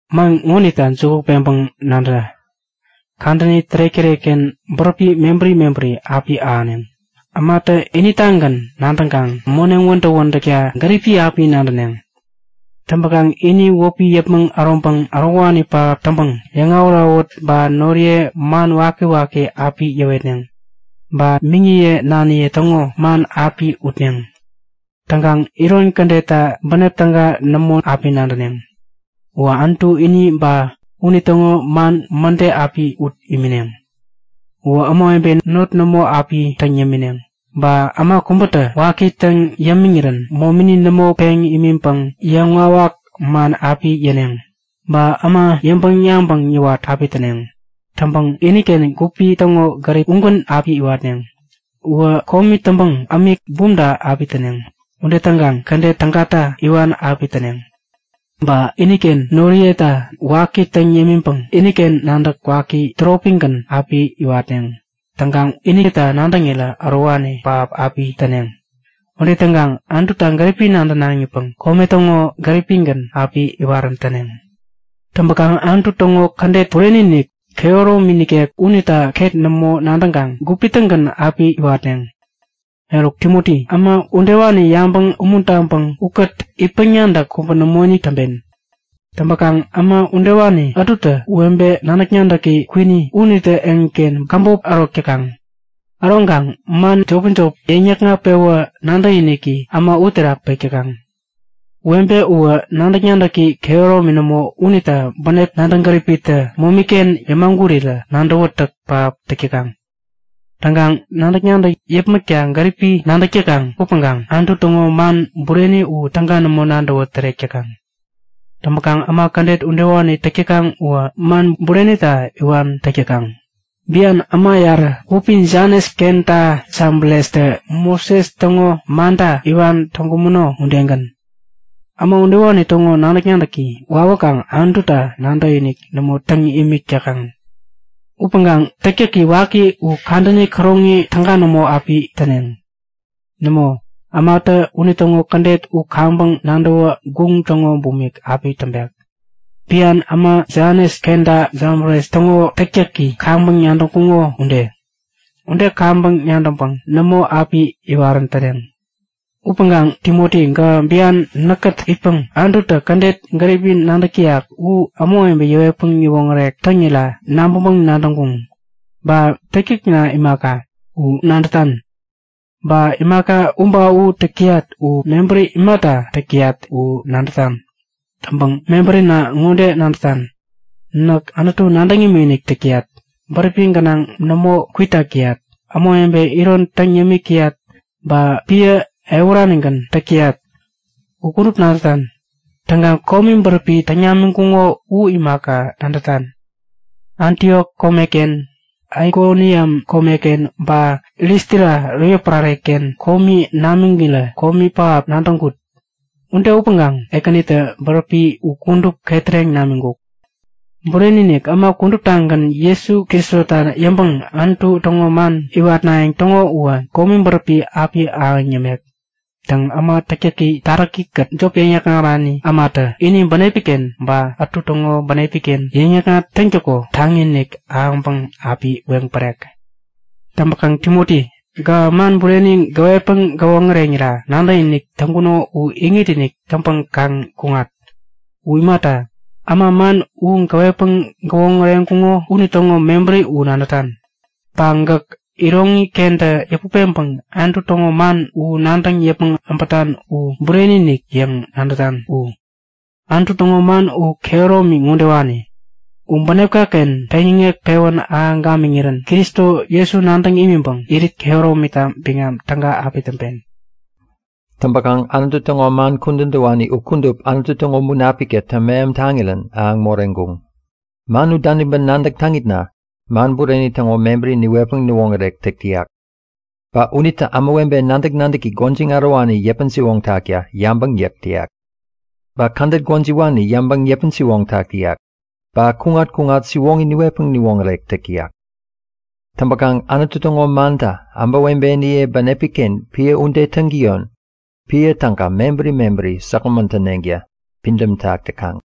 Man ŋonita juku peŋpäŋ nadä! Kadäni tärek-tärekken bäräpi mebäri mebäri api ahäneŋ. Ämatä initagän nadäŋkaŋ moneŋ wädäk-wädäkta gäripi api nadäneŋ. Täŋpäkaŋ ini wäpi yäpmäŋ äroŋpäŋ ärowani pähap täŋpäŋ yäŋawät-awät ba noriye man wakiwaki api yäwetneŋ. Ba miŋiye naniye täŋo man api utneŋ. Täŋkaŋ iron kädetta bänep täga nämo api nadäneŋ. Uwä Anutu ini ba, unitäŋo man mäde api ut imineŋ. Uwä ämawebe not nämo api täŋ yämineŋ, ba äma kubätä waki täŋ yämiŋirän momini nämo peŋ imiŋpäŋ yäŋwawak man api yäneŋ. Ba äma yäŋpäŋ-yabäŋ yäwat api täneŋ. Täŋpäŋ iniken gupi täŋo gärip ugän api iwatneŋ. Uwä komi täŋpäŋ ämik bumta api täneŋ. Ude täŋkaŋ kädet tägata iwan api täneŋ. Ba iniken noriyeta waki täŋ yämiŋpäŋ iniken nadäk waki täropigän api iwatneŋ. Täŋkaŋ inita nadäŋirä ärowani pähap api täneŋ. Ude täŋkaŋ Anututa gäripi nadänaŋipäŋ kome täŋo gäripgän api iwarän täneŋ. Täŋpäkaŋ Anutu täŋo kädet bureni-inik, kehäromi nikek unita ket nämo nadäŋkaŋ gupi-tägän api iwatneŋ. Eruk Timoti, äma udewani yabäŋ umuntaŋpäŋ ukät itpäŋ-nadäk kubä nämoinik täŋpen. Täŋpäkaŋ äma udewani ätutä webe nadäk-nadäki kwini unitä eŋiken käbop ärok täkaŋ. Äroŋkaŋ man jopi-jopi yäŋ-yäkŋat-pewä nadäkiniki äma uterak pek täkaŋ. Webe uwä nadäk-nadäki kehäromi nämo unita bänep nadäŋ gäripitä momi-ken yämagurirä nadäwätäk pähap täk täkaŋ. Täŋkaŋ nadäk-nadäk yäpmäkta gäripi nadäk täkaŋ upäŋkaŋ Anutu täŋo man bureni u täga nämo nadäwä tärek täkaŋ. Täŋpäkaŋ äma kädet udewani täk täkaŋ uwä man burenita iwan täk täkaŋ, bian äma yarä wäpi Janes kenta Jabrestä Moses täŋo manta iwan täŋkumäno udegän. Äma udewani täŋo nadäk-nadäki wawäkaŋ Anututa nadäkinik nämo täŋ imik täkaŋ. Upäŋkaŋ täktäki waki u kadäni käroŋi täga nämo api täneŋ. Nämo, ämatä unitäŋo kädet u kaŋpäŋ nadäwä guŋ täŋo bumik api täŋpek, bian äma Janes kenta Jabres täŋo täktäki kaŋpäŋ nadäŋkuŋo ude. Ude kaŋpäŋ nadäŋpäŋ nämo api iwarän täneŋ. Upäŋkaŋ Timoti gähä bian näkkät itpäŋ Anututä kädet gäripi nadäk täyak u ämawebe yäwetpäŋ yäwoŋärek täŋira nabäŋpäŋ-nadäŋkun. Ba täktäkna imaka, u nadätan. Ba imaka u ba u täk täyat u mebäri imata täk täyat u nadätan. Täŋpäŋ mebärina ŋode nadätan; Näk Anutu nadäŋ imikinik täk täyat, bäräpi gänaŋ nämo kwitak täyat, ämawebe iron täŋ yämik täyat, ba piä ehuranigän täk täyat. U kudup nadätan. Täŋkaŋ komi bäräpi täŋ namiŋkuŋo u imaka, nadätan. Antiok komeken, Aikoniam komeken, ba Listra yotpärare-ken komi namiŋirä komi pähap nadäŋkut. Ude upäŋkaŋ Ekänitä bäräpi u kudup ketäreŋ namiŋkuk. Bureni-inik, äma kuduptagän Jesu Kristota yäŋpäŋ Anutu täŋo man iwatnayäŋ täŋo uwä komi bäräpi api ahäŋ yämek. Täŋ, äma täktäki taräkikät jop yäŋ-yäkŋarani ämatä ini bänepken ba ätu täŋo bänepiken yäŋ-yäkŋat piä täŋtäko taŋi-inik ahäŋpäŋ api weŋ pärek. Täŋpäkaŋ Timoti, gähä man bureni gäwetpäŋ gäwoŋäreŋirä nadäkinik täŋkuno u iŋit-inik täŋpäŋ kaŋ kuŋat. U imata, äma man u gäwetpäŋ gäwoŋäreŋkuŋo unitäŋo mebäri u nadätan. Ba gäk iroŋikentä yäput peŋpäŋ Anutu täŋo man u nadäŋ yäpmäŋ äbätan u bureni-inik yäŋ nadätan u. Anutu täŋo man u kehäromi ŋodewani; U bänepka-ken peŋyäŋek pewän ahäŋ gamiŋirän Kristo Jesu nadäŋ imiŋpäŋ irit kehäromita biŋam täga api täŋpen. Täŋpäkaŋ Anutu täŋo man kudän täwani u kudup Anutu täŋo Munapiktä täŋmeham taŋirän ahäŋ moreŋkuŋ. Man u daniŋpäŋ nadäk täŋitna man bureni täŋo mebäri niwetpäŋ niwoŋärek täk täyak. Ba unitä ämawebe nadäk-nadäki gwäjiŋ ärowani yäpän-siwoŋtakta yabäŋ yäk täyak. Ba kädet gwäjiwani yäŋpäŋ yäpän-siwoŋtak täyak, ba kuŋat-kuŋat siwoŋi niwetpäŋ niwoŋärek täk täyak. Täŋpäkaŋ Anutu täŋo mantä ämawebeniye bänepi-ken piä ude täŋtäyon piä täga mebäri mebäri säkgämän täneŋta pidämtak täkaŋ.